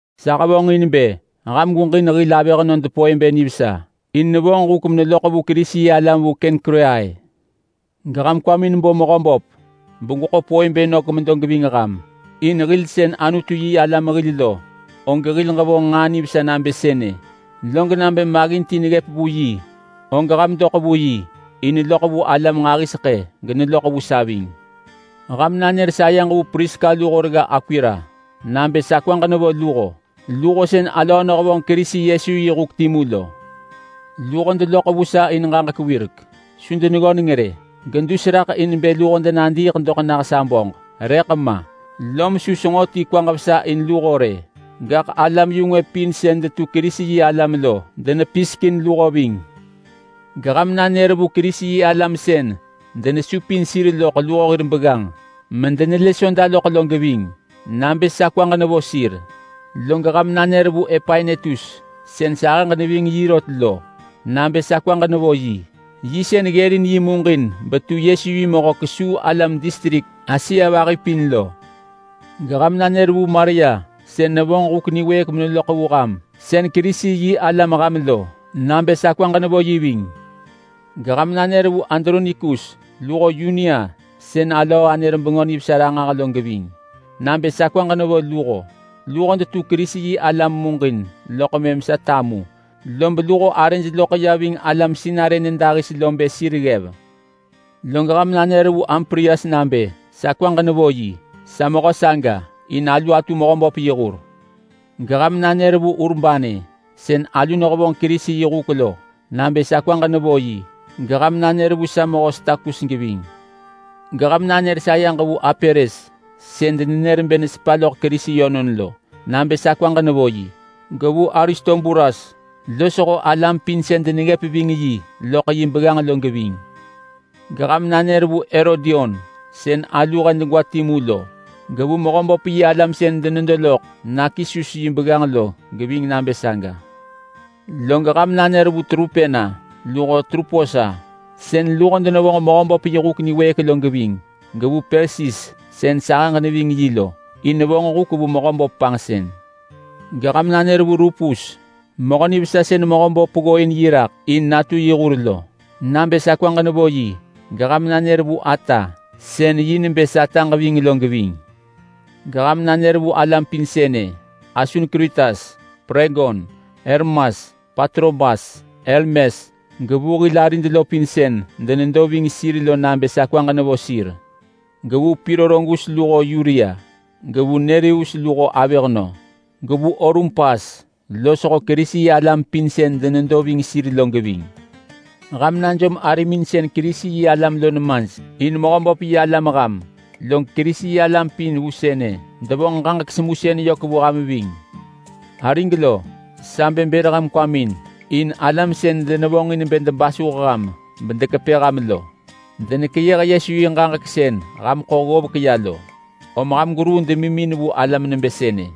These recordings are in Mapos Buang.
Sa hevonġin bë ham gweġin hil avëhnöd Poebe nivesa. In nevonġ huk meneloḳ vu Kerisi-yi-alam vu Kengkreai. Geham kwamin bo Mehöböp begweḳo Poebe nök medo geving ham. In hil sën Anutu-yi-alam hil lo, og hil ġevonġ nġaa nivesa nabë sënë. Log nabë maggin ti neggëp vu yi, og ham doḳ vu yi. In neloḳ vu alam nġahiseḳë geneloḳ vu sa ving. Ham nanër sayeġ vu Priska luho regga Akwila nabë sa kwaġ nevo luho. Luho sën alöö nehevonġ Kerisi Yesu yi huk timu lo. Luho deloḳ vu sa in ġaġek wirek. Su deneggöneng rë, gedus raḳ in bë luho denadiiḳ doḳ nah sa böġ rëḳ ma. Lom su senġo ti kwaġ vesa in luho rë. Gaḳ alam-yu-ngwë pin sën detu Kerisi-yi-alam lo denepisek in luho ving. Geham nanër vu Kerisi-yi-alam sën denesupin sir loḳ luho hir begganġ medenelë Soda loḳ lo geving nabë sa kwaġ nevo sir. Log ham nanër vu Epainetus sën sahëġ neving yi rot lo nabë sa kwaġ nevo yi. Yi sën ggërin yi muġin betu Yesu yi mehö kesuu alam distrik Asia vahi pin lo. Geham nanër vu Maria sën nevonġ huk niwëëk meneloḳ vu ham sën Kerisi-yi-alam ham lo nabë sa kwaġ nevo yi ving. Geham nanër vu Adronikus luho Yunia sën alöö anër Bengö Nivesa ranġah lo geving nabë sa kwaġ nevo luho. Luho detu Kerisi-yi-alam muġin loḳ mëm sa tamu, lob luho arëj loḳ ya ving alam sinarë nyëdahis bë sir ggev. Log ham nanër vu Amplias nabë sa kwaġ nevo yi. Sa mehö saga, in alu atu Mehöböp yi hur. Geham nanër vu Urbane, sën alu nehevonġ Kerisi yi huk lo nabë sa kwaġ nevo yi, geham nanër vu sa mehö Stakus geving. Geham nanër sayeġ vu Apeles sën denenër bë nesepa loḳ Kerisi yönon lo nabë sa kwaġ nevo yi. Gevu Aristobulas losho alam pin sën deneggëp ving yi loḳ yi begganġ lo geving. Geham nanër vu Herodion sën alu he degwa timu lo, gevu Mehöböp-yi-alam sën denedo loḳ Narkisus yi begganġ lo geving nabë saga. Log ham nanër vu Trupena luho Truposa sën luho denevonġ Mehöböp yi huk niwëëk lo geving, gevu Persis sën sahëġ neving yi lo, in nevonġ huk vu Mehöböp panġsën lo. Geham nanër vu Rupus, mehö nivesa sën Mehöböp ggooin yi raḳ in natu yi hur lo, nabë sa kwaġ nevo yi, geham nanër vu ata sën vonġ bë sataġ ving lo geving. Geham nanër vu alam pin sënë: Asunkritas, Plegon, Hermas, Patrobas, Hermes, gevu hil arid lo pin sën denedo ving sir lo nabë sa kwaġ nevo sir. Gevu Pilologus luho Yulia, gevu Nereus luho avëhnö, gevu Olumpas losho Kerisi-yi-alam pin sën denedo ving sir lo geving. Ham najom arimin sën Kerisi-yi-alam lo nemaj in Mehöböp-yi-alam ham, log Kerisi-yi-alam pin vu sënë denevonġ ġaġek semusën yök vu ham ving. Arig lo, sa bë bër ham kwamin in alam sën denevonġin bë debasuh ham bedekepë ham lo. Denekeyëh Yesu yi ġaġek sën ham ḳo ggovek ya lo, om ham gweruu demimin vu alam nebë sënë!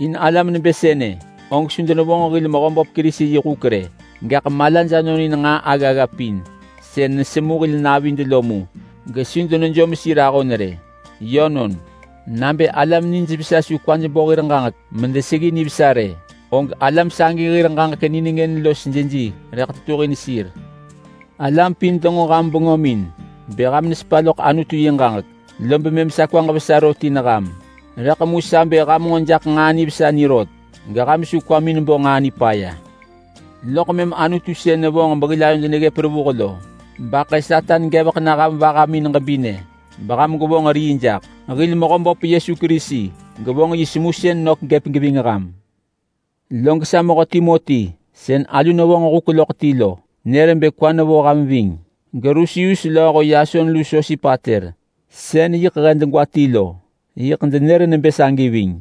In alam nebë sënë og su denevonġ hil Mehöböp Kerisi yi huk rë. Gaḳ malaj anonin nġaa aggagga pin sën nesemu hil navid lo mu gesu denejom sir ahon rë. Yönon, nabë alam nijvesa su kwaj bo hir ġaġek medeseggi nivesa rë, og alam sagi hir ġaġek nengën los jeji rëḳ tetuhin sir. Alam pin denġo ham bengömin bë ham nesepa loḳ Anutu yi ġaġek, lob mëm sa kwaġ vesa rot in ham. Rëḳ mu sa bë ham nġo jaḳ nġaa nivesa ni rot, geham su kwamin bo nġaa nipaya. Loḳ mëm Anutu sën nevonġ behil ayod neggëp revuh lo baḳë Satan gevek na ham vahamin ġebinë beham gwevonġ rii jaḳ. Hil Mehöböp Yesu Kerisi gevonġ yi semusën nök vu ham. Log sa mehö Timoti sën alu nehevonġ huk loḳ ti lo nër bë kwa nevo ham ving. GeLusius lööho Yason lu Sosipater sën yiḳ he degwa ti lo, yiḳ denenër nebë sagi ving.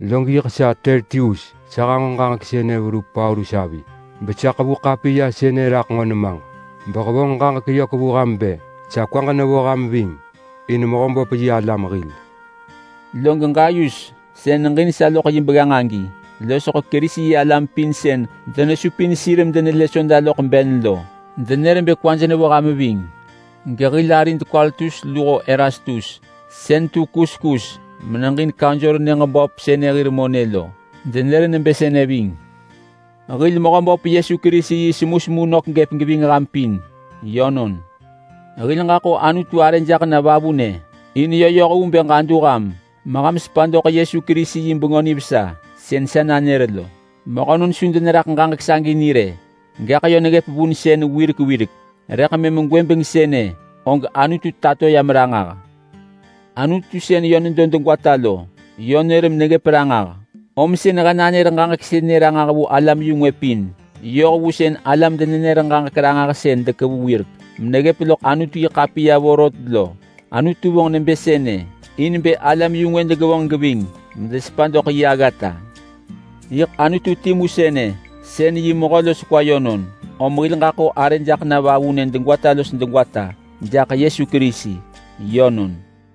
Log sa Tertius, sa hanġo ġaġek sënë raḳ verup Paulus avi besa ḳevu ḳapiya sënë raḳ nġo nemaġ. Sa hevonġ ġaġek yök vu ham bë sa kwaġ nevo ham ving in Mehöböp-yi-alam hil. Log Gayus sën neġin sa loḳ yi begganġ agi losho Kerisi-yi-alam pin sën denesupin sir medenelë Soda loḳ ben lo, denenër bë kwaj nevo ham ving. Gehil arid Kwartus luho Erastus, sën tu kuskus meneġin kaunsor nyëġ böp sënë hir monë lo denenër nebë sënë ving. [Hil Mehöböp Yesu Kerisi yi semusemu nök gëp geving ham pin. Yönon.] Hil ġaḳo Anutu arë jaḳ na vavunë in yö yoh vu bë ġadu ham meham sepa doḳ Yesu Kerisi yi Bengö Nivesa sën sa nanër lo. Mehönon su deneraḳ ġaġek sagi ni rë, gaḳ yö neggëp vunsën wirek wirek, rëḳ mëm gwëbeng sënë og Anutu tato yam ranġah. Anutu sën yö nedo degwata lo yö nër meneggëp ranġah, om sën he nanër ġaġek sënë ranġah vu alam-yu-ngwë pin yoh vu sën alam-denenër-ġaġek-ranġahsën dekevu wirek meneggëp loḳ Anutu-yi-ḳapiya vorot lo. Anutu vonġ nebë sënë in bë alam-yu-ngwë degevonġ geving medesepa doḳ yi aggata. Yiḳ Anutu timu sënë sën yi mehö los kwa yönon, om hil ġaḳo arë jaḳ na vavunë degwata los degwata jaḳ Yesu Kerisi. Yönon.